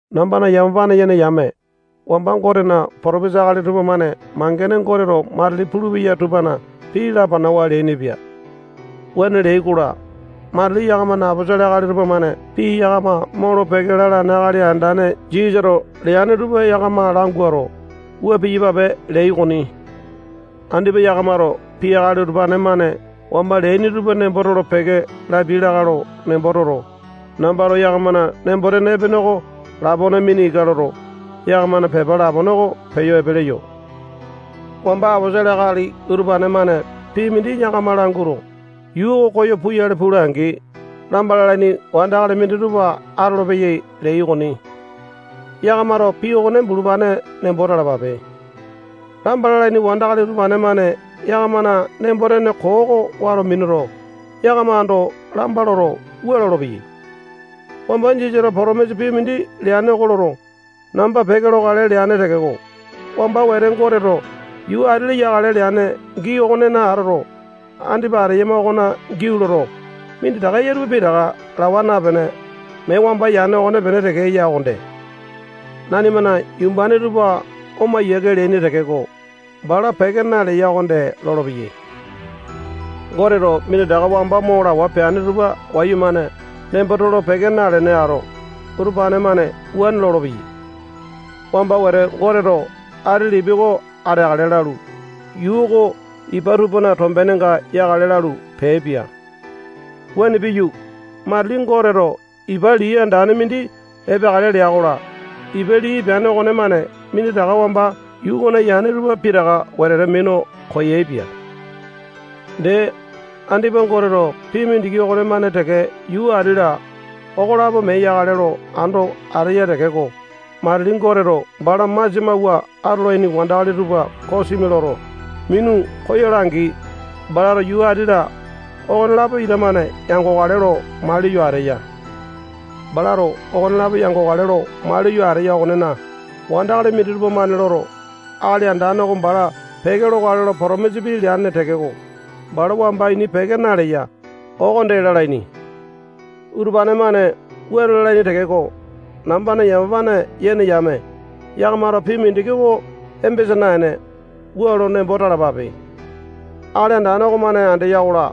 Nambana yamapane yene yame, wamba Gotena potopesa akali tupamane mangene Goteto matili pulupeya tupana pii lapanawa leainipia. Wuane leai-kola, matili yakamana aposolo akali tupamane pii yakama molo-peke lalane Akali Andane Jisasato leane tupa yakama languato, wua piyapape leai okoni. Andipa yakamato pii akali utupane-mane wamba leaini tupa nembo tolo-peke lapiai lakae lo nembo toto, nambato yakamana nembo-tene epene oko lapone mina ika loto, yakamana pepa lapone oko peyo epe leyo. Wamba aposolo akali utupane-mane pii mindi yakama languato, yuu oko koyo puyale pula-angi, lamba lalaini wandakali minditupa atolopeyai leai okoni. Yakamato pii okone bulupane nembo talapape. Lamba lalaini wandakali utupane-mane yakamana nembo-tene koo oko wato minuto, yakama ando lamba loto, wua lolopeyai: Wamba Jisasato potomisa pii mindi leane oko loto, namba peke lokale leane tekeko, wamba wete Goteto yuu ati-la yakale leane gii okonena atoto, andipa ateyama okona giau loto, minditaka eya tupa pitaka lawa napene, mee wamba yane okonepene teke eya okonde. Nanimana yumbane tupa oma yiake leaini tekeko, bala peke naleya okonde lolopeyai. Goteto minditaka wamba mo lawa peane tupa wayumane nembo tolo-peke nalene ato, utupane-mane wuane lolopeyai. Wamba wete Goteto ati lipi oko ateakale lalu, yuu oko ipa tupana tombenenga yakale lalu, peaipia. Wuane piyu, matili Goteto ipa lii andane mindi epeakale lea-kola, ipa lii epeane okonemane minditaka wamba yuu okona yane tupa pitaka wetete minu koyaepia. Dee, andipa Goteto pii mindiki okonemane teke yuu ati-la, okolapo mee yakale lo ando ateya tekeko, matili Goteto bala masia mawua atolaini wandakali tupa kosimi loto, minu koyola-angi, balato yuu ati-la, okonelapo ita-mane yangokale lo maliyo ateya. Balato okonelapo yangokale lo maliyo ateya okonena, wandakali minditupa-mane loto, Akali Andane oko bala peke lokale lo potomisa pii leane tekeko, bala wamba ini peke naleya, okonde lalaini. Utupane-mane wuane lalaini tekeko, nambana yamapane yene yame, yakamato pii mindiki oko embesa naene, wua lo nembo talapape: Akali Andane okomane andeya-kola,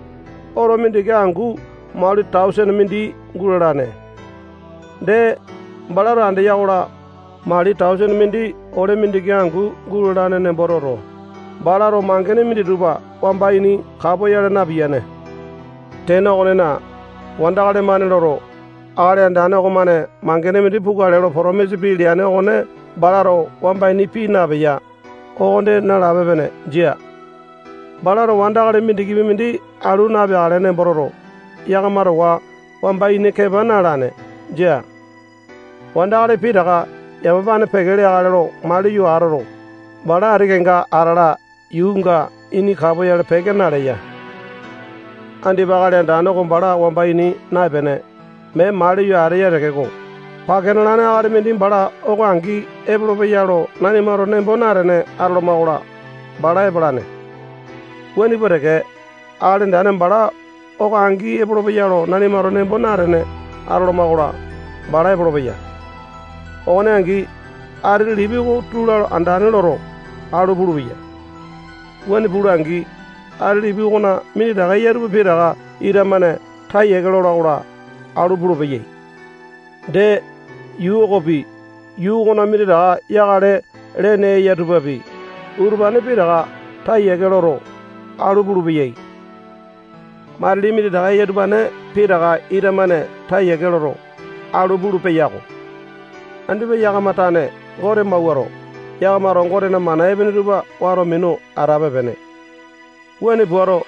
oto mindiki angu mali tausene mindi gulalane. Dee, balato andeya-kola, mali tausene mindi ole mindiki angu gulalane nembo toto, balato mangene minditupa wamba ini kapoyale napiyane. Tene okonena, wandakali-mane loto, Akali Andane okomane mangene mindi pukale lo potomisa pii leane okone balato wamba ini pii napeya, okonde nalape-pene. Jia. Balato wandakali mindikipi mindi alu napeakale nembo toto, yakama towa wamba ini kepa na-alane. Jia. Wandakali pitaka yamapane peke leakale lo maliyo atoto, bala ati kenga atala yuunga ini kapoyale peke naleya. Andipa Akali Andane oko bala wamba ini naepene, mee maliyo ateya tekeko, pake nalane akali mindi bala oko angi epolopeya lo nanimato nembo natene atoloma-kola, bala epalane. Wuane pua teke, Akali Andane bala oko angi epolopeya lo nanimato nembo natene atoloma-kola, bala epolopeya. Okone angi, ati lipi oko tula andane loto, alu pulupeya. Wuane pula-angi, ati lipi okona minditaka eya tupa pitaka ita-mane taa yiake lola-kola, alu pulupeyai. Dee, yuu okopi, yuu okona minditaka yakale lene eya tupapi, utupane pitaka taa yiake loto, alu pulupeyai. Matili minditaka eya utupane pitaka ita-mane taa yiake loto, alu pulu-peyako. Andipa yakama tane Gote mawuato, yakamato Gotena mana epene tupa wato minu atape-pene. Wuane puato,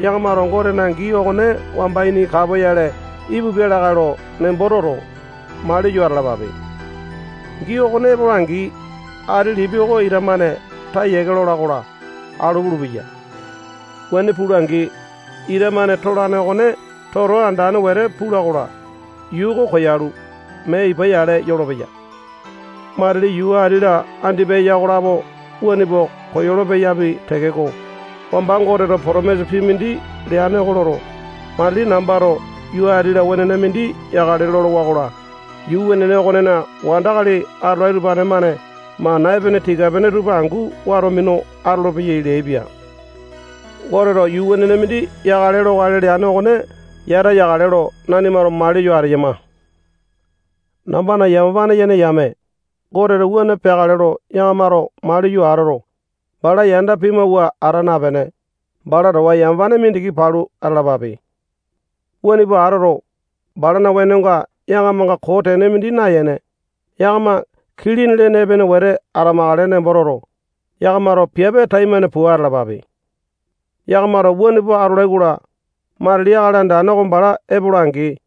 yakamato Gotena gii okone wamba ini kapoyale ipupia lakae lo nembo toto, maliyo atalapape. Gii okone epola-angi, ati lipi oko ita-mane taa yiake lola-kola, alu pulupeya. Wuane pula-angi, ita-mane tolane okone toto andane wete pula-kola, yuu oko koyalu, mee ipa yale yolopeya. Matili yuu ati-la andipa eya okolapo wuane pua koyolo-peyapi tekeko, wamba Goteto potomisa pii mindi leane oko loto, matili nambato yuu ati-la wenene mindi yakale lolowa-kola, yuu wenene okonena wandakali atolai utupane-mane mana epene tika-pene tupa angu wato minu atolopeyai leaipia. Goteto yuu wenene mindi yakale lokale leane okone yata yakale lo nanimato maliyo ateyama. Nambana yamapane yene yame, Goteto wuane peakale lo yakamato maliyo atoto, bala yanda pimawua ata napene, bala towa yamapane mindiki palu atalapape. Wuane pua atoto, balana wenonga yakamanga koo tene mindi nayene, yakama kilini lene epene wete atamakale nembo toto, yakamato piape taimane pua atalapape. Yakamato wuane pua atolai-kola, matili Akali Andane oko bala epola-angi,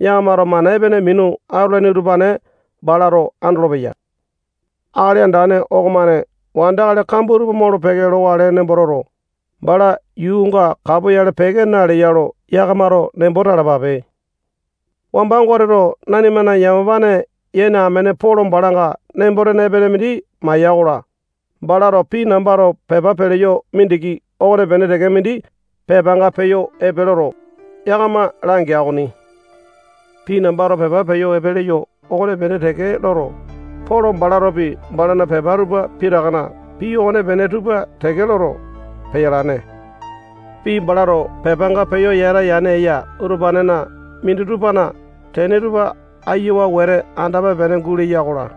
yakamato mana epene minu atolaini utupane balato andolopeya. Akali Andane okomane wandakali kambua tupa molo-peke lokale nembo toto, bala yuunga kapoyale peke naleya lo yakamato nembo talapape. Wamba Goteto nanimana yamapane yene amene Polo balanga nembo-tene epene mindi maya-kola, balato pii nambato pepa peleyo mindiki okonepene teke mindi pepanga peyo epe loto, yakama langea okoni. Pii nambato pepa peyo epe leyo okonepene teke loto, Polo balatopi balana pepa tupa pitakana pii okonepene tupa teke loto, peyalane. Pii balato pepanga peyo yata yane eya utupanena minditupana tene tupa ayiawa wete andape-pene guleya-kola,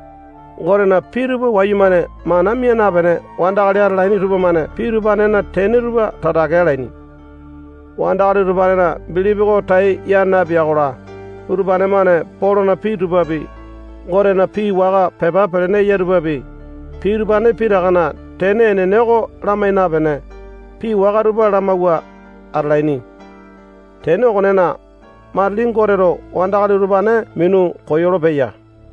Gotena pii tupa wayumane mana mia napene wandakali atalaini tupamane pii utupanena tene tupa tatake alaini. Wandakali utupanena bilipi oko tai ya napeya-kola, utupane-mane Polona pii tupapi, Gotena pii waka pepa pelene eya tupapi, pii utupane pitakana tene enene oko lamai napene, pii waka tupa lamawua atalaini. Tene okonena, matili Goteto wandakali utupane minu koyolo-peya.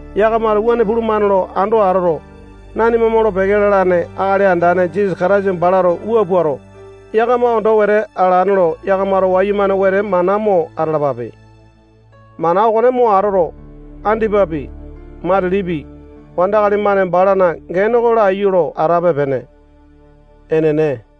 Yakamato wuane pulumane lo ando atoto, nanima molo-peke lalane Akali Andane Jisasa Kataisa balato wua puato, yakama ondo wete alane lo yakamato wayumane wete mana mo atalapape. Mana okone mo atoto, andipapi, matilipi, wandakali-mane balana gene oko laiyu lo atape-pene. Enene.